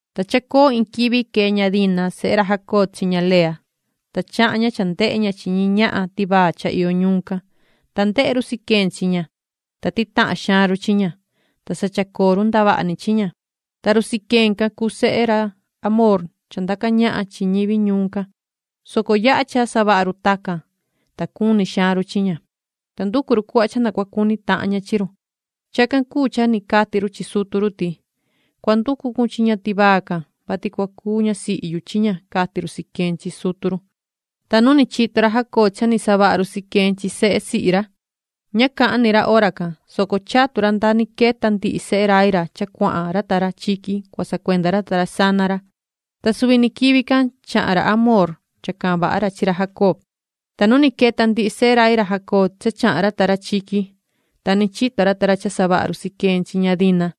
Ta chacoo iin quivi quee ña Dina sehe ra Jacob chi ña Lea, ta chahan ña cha ndehe ña chi ñi ñahan tivaa cha iyo ñuun can. Ta ndehe run Siquem chi ña, ta titahan xaan run chi ña, ta sa chacoo run ndavaha ni chi ña. Ta run Siquem can cuu sehe ra Hamoor cha ndaca ñahan chi ñivi ñuun can, soco yaha cha savaha run tacan, ta cuni xaan run chi ña, ta nducu run cuhva cha na cua cuni tahan ña chi run. Chacan cuu cha ni cati run chi sutu run ti: ―Cua nducu cun chi ña tivaa can, vati cua cuu ñasihi yu ―cati run Siquem chi sutu run. Ta nu ni chito ra Jacob cha ni savaha run Siquem chi sehe sihi ra, ña cahan ni ra hora can, soco chatu ra nda ni queta ndihi sehe rai ra cha cuahan ra ta ra chiqui cua sacuenda ra ta ra sana ra. Ta suvi ni quivi can chahan ra Hamoor cha cahan vaha ra chi ra Jacob. Ta nu ni queta ndihi sehe rai ra Jacob cha chahan ra ta ra chiqui, ta ni chito ra ta ra cha savaha run Siquem chi ña Dina.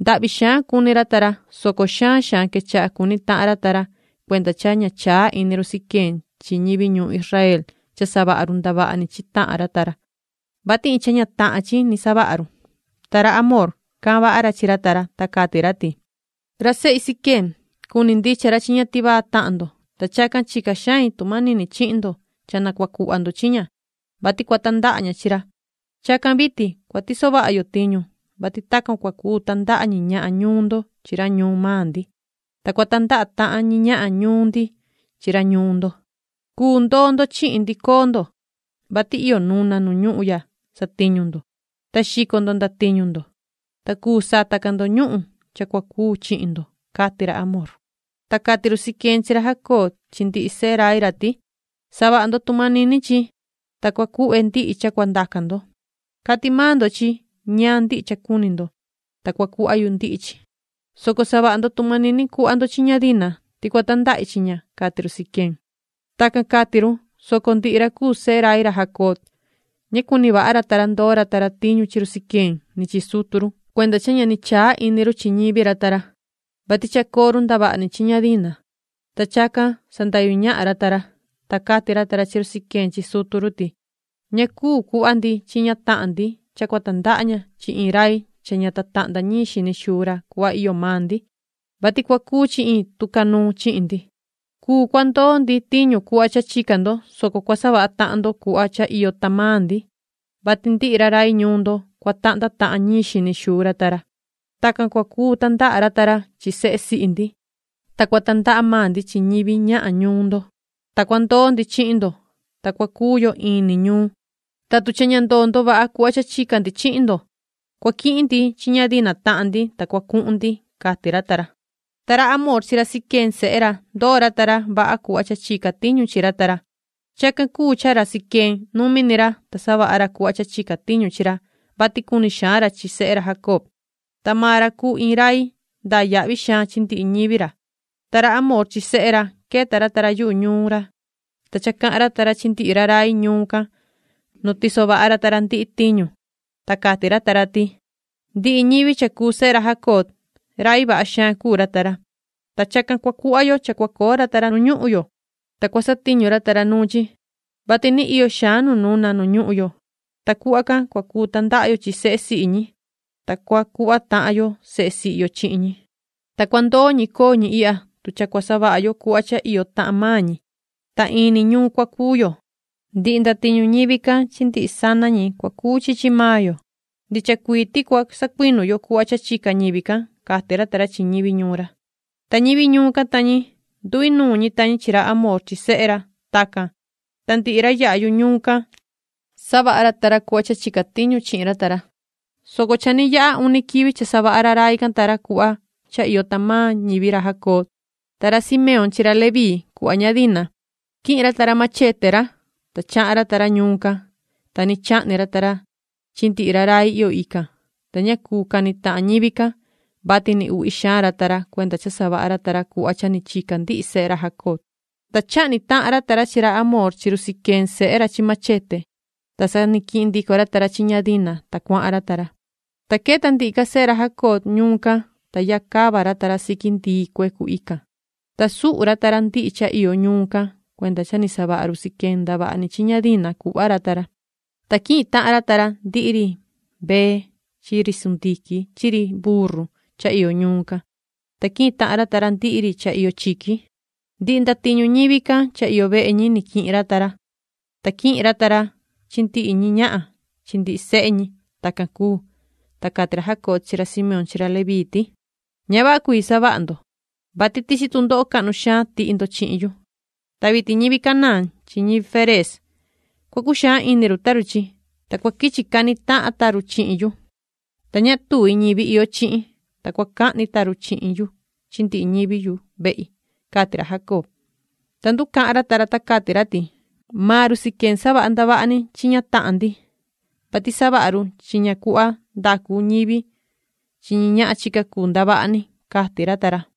Ndahvi xaan cuni ra ta ra, soco xaan xaan quechaha cuni tahan ra ta ra cuenda cha ña chaa ini run Siquem chi ñivi ñuun Israel cha savaha run ndavaha ni chi tahan ra ta ra, vati iin cha ña tahan chi ni savaha run. Ta ra Hamoor, cahan vaha ra chi ra ta ra, ta cati ra ti: ―Ra sehi Siquem, cuni ndicha ra chi ña tivaa tahan ndo, ta chacan chica xain tu manini chihin ndo cha na cua cuhva ndo chi ña, vati cua tandaha ña chi ra. Chacan vitin cua tiso vaha yo tiñu, vati tacan cua cuu tandaha ñi ñahan ñuun ndo chi ra ñuun maan ndi, ta cua tandaha tahan ñi ñahan ñuun ndi chi ra ñuun ndo. Cuu ndoo ndo chihin ndi. Coo ndo, vati iyo nuna nu ñuhun ya satiñu ndo, ta xico ndo ndatiñu ndo, ta cuu sata ca ndo ñuhun cha cua cuu chihin ndo ―cati ra Hamoor. Ta cati run Siquem chi ra Jacob chi ndihi sehe rai ra ti: ―Savaha ndo tu manini chi, ta cua cuhve ndihi cha cua ndaca ndo. Cati maan ndo chi ñaan ndihi cha cuni ndo, ta cua cuhva yu ndihi chi, soco savaha ndo tu manini cuhva ndo chi ña Dina, ti cua tandahi chi ña ―cati run Siquem. Tacan cati run, soco ndihi ra cuu sehe rai ra Jacob, ña cuni vaha ra ta ra ndoo ra ta ra tiñu chi run Siquem ni chi sutu run cuenda cha ña ni chaa ini run chi ñivi ra ta ra, vati chacoo run ndavaha chi ña Dina, ta chacan sandahyu ñahan ra ta ra. Ta cati ra ta ra chi run Siquem chi sutu run ti: ―Ña cuu cuhva ndi chi ña tahan ndi cha cua tandaha ña chi iin rai cha ña tahnda ñiin xini xuu ra cuhva iyo maan ndi, vati cua cuu chi iin tucanuun chihin ndi. Cuu cua ndoo ndi tiñu cuhva cha chica ndo, soco cua savaha tahan ndo cuhva cha iyo tahan maan ndi, vati ndihi ra rai ñuun ndo, cua tahnda tahan ñiin xini xuu ra ta ra. Tacan cua cuu tandaha ra ta ra chi sehe sihi ndi, ta cua tandaha maan ndi chi ñivi ñahan ñuun ndo. Ta cua ndoo ndi chihin ndo, ta cua cuu yo in ni ñuun. Ta tu cha ña ndoo ndo vaha cuhva cha chica ndi chihin ndo, cua quihin ndi chi ña Dina tahan ndi, ta cua cuhun ndi ―cati ra ta ra. Ta ra Hamoor chi ra Siquem sehe ra, ndoo ra ta ra vaha cuhva cha chica tiñu chi ra ta ra. Chacan cuu cha ra Siquem, numi ni ra, ta savaha ra cuhva cha chica tiñu chi ra, vati cuni xaan ra chi sehe ra Jacob. Ta maan ra cuu iin rai ndaa yahvi xaan chi ndihi ñivi ra. Ta ra Hamoor chi sehe ra, queta ra ta ra yuhu ñuun ra, ta cha cahan ra ta ra chi ndihi ra rai ñuun can nu tiso vaha ra ta ra ndihi tiñu. Ta cati ra ta ra ti: ―Ndihi ñivi cha cuu sehe ra Jacob, rai vaha xaan cuu ra ta ra, ta chacan cua cuhva yo cha cua coo ra ta ra nu ñuhun yo, ta cua satiñu ra ta ra nuun chi, vati ni iyo xaan nu nuna nu ñuhun yo, ta cuhva can cua cuu tandaha yo chi sehe sihi ñi, ta cua cuhva tahan yo sehe sihi yo chihin ñi. Ta cua ndoo ñi coo ñi ihya tu cha cua savaha yo cuhva cha iyo tahan maan ñi, ta in ni ñuun cua cuu yo. Ndihi ndatiñu ñivi can chi ndihi sana ñi cua cuu chi chi maan yo, ndicha cuii ti cua sacuinu yo cuhva cha chica ñivi can ―cati ra ta ra chi ñivi ñuun ra. Ta ñivi ñuun can ta ñi, nduinuun ñi ta ñi chi ra Hamoor chi sehe ra. Tacan, ta ndihi ra yaha yuhu ñuun can, savaha ra ta ra cuhva cha chica tiñu chi ra ta ra, soco cha ni yaha uni quivi cha savaha ra rai can ta ra cuhva cha iyo tahan maan ñivi ra Jacob, ta ra Simeón chi ra Leví cuhva ña Dina, quihin ra ta ra machete ra, ta chahan ra ta ra ñuun can, ta ni chahni ra ta ra chi ndihi ra rai iyo ican, ta ña cuu cani tahan ñivi can, vati ni uhvi xaan ra ta ra cuenda cha savaha ra ta ra cuhva cha ni chica ndihi sehe ra Jacob. Ta chahni tahan ra ta ra chi ra Hamoor chi run Siquem sehe ra chi machete ra, ta sa ni quihin ndico ra ta ra chi ña Dina, ta cuahan ra ta ra. Ta queta ndihi ca sehe ra Jacob ñuun can, ta yaha cava ra ta ra siqui ndii cuecu ican, ta suhu ra ta ra ndihi cha iyo ñuun can cuenda cha ni savaha run Siquem ndavaha ni chi ña Dina cuhva ra ta ra. Ta quihin tahan ra ta ra ndihi ri mbee chi ri chi chivu chi ri sundiquin chi ri burru cha iyo ñuun can, ta quihin tahan ra ta ra ndihi ri cha iyo chiqui. Ndihi ndatiñu ñivi can cha iyo vehe ñi ni quihin ra ta ra, ta quihin ra ta ra chi ndihi ñi ñahan chi ndihi sehe ñi. Tacan cuu, ta cati ra Jacob chi ra Simeón chi ra Leví ti: ―Ña vaha cuii savaha ndo, vati tichi tundoho cahnu xaan tihi ndo chihin yu. Ta vitin ñivi Canaán chi ñivi Ferez, cua cuxaan ini run ta run chi, ta cua quichi cani tahan ta run chihin yu, ta ña tuvi ñivi iyo chihin. Ta cua cahni ta run chihin yu chi ndihi ñivi yu vehi ―cati ra Jacob. Ta nducahan ra ta ra, ta cati ra ti: ―Maan run Siquem savaha ndavaha ni chi ña tahan ndi, vati savaha run chi ña cuhva cha ndacu ñivi chi ñi ñahan chica cuu ndavaha ni ―cati ra ta ra.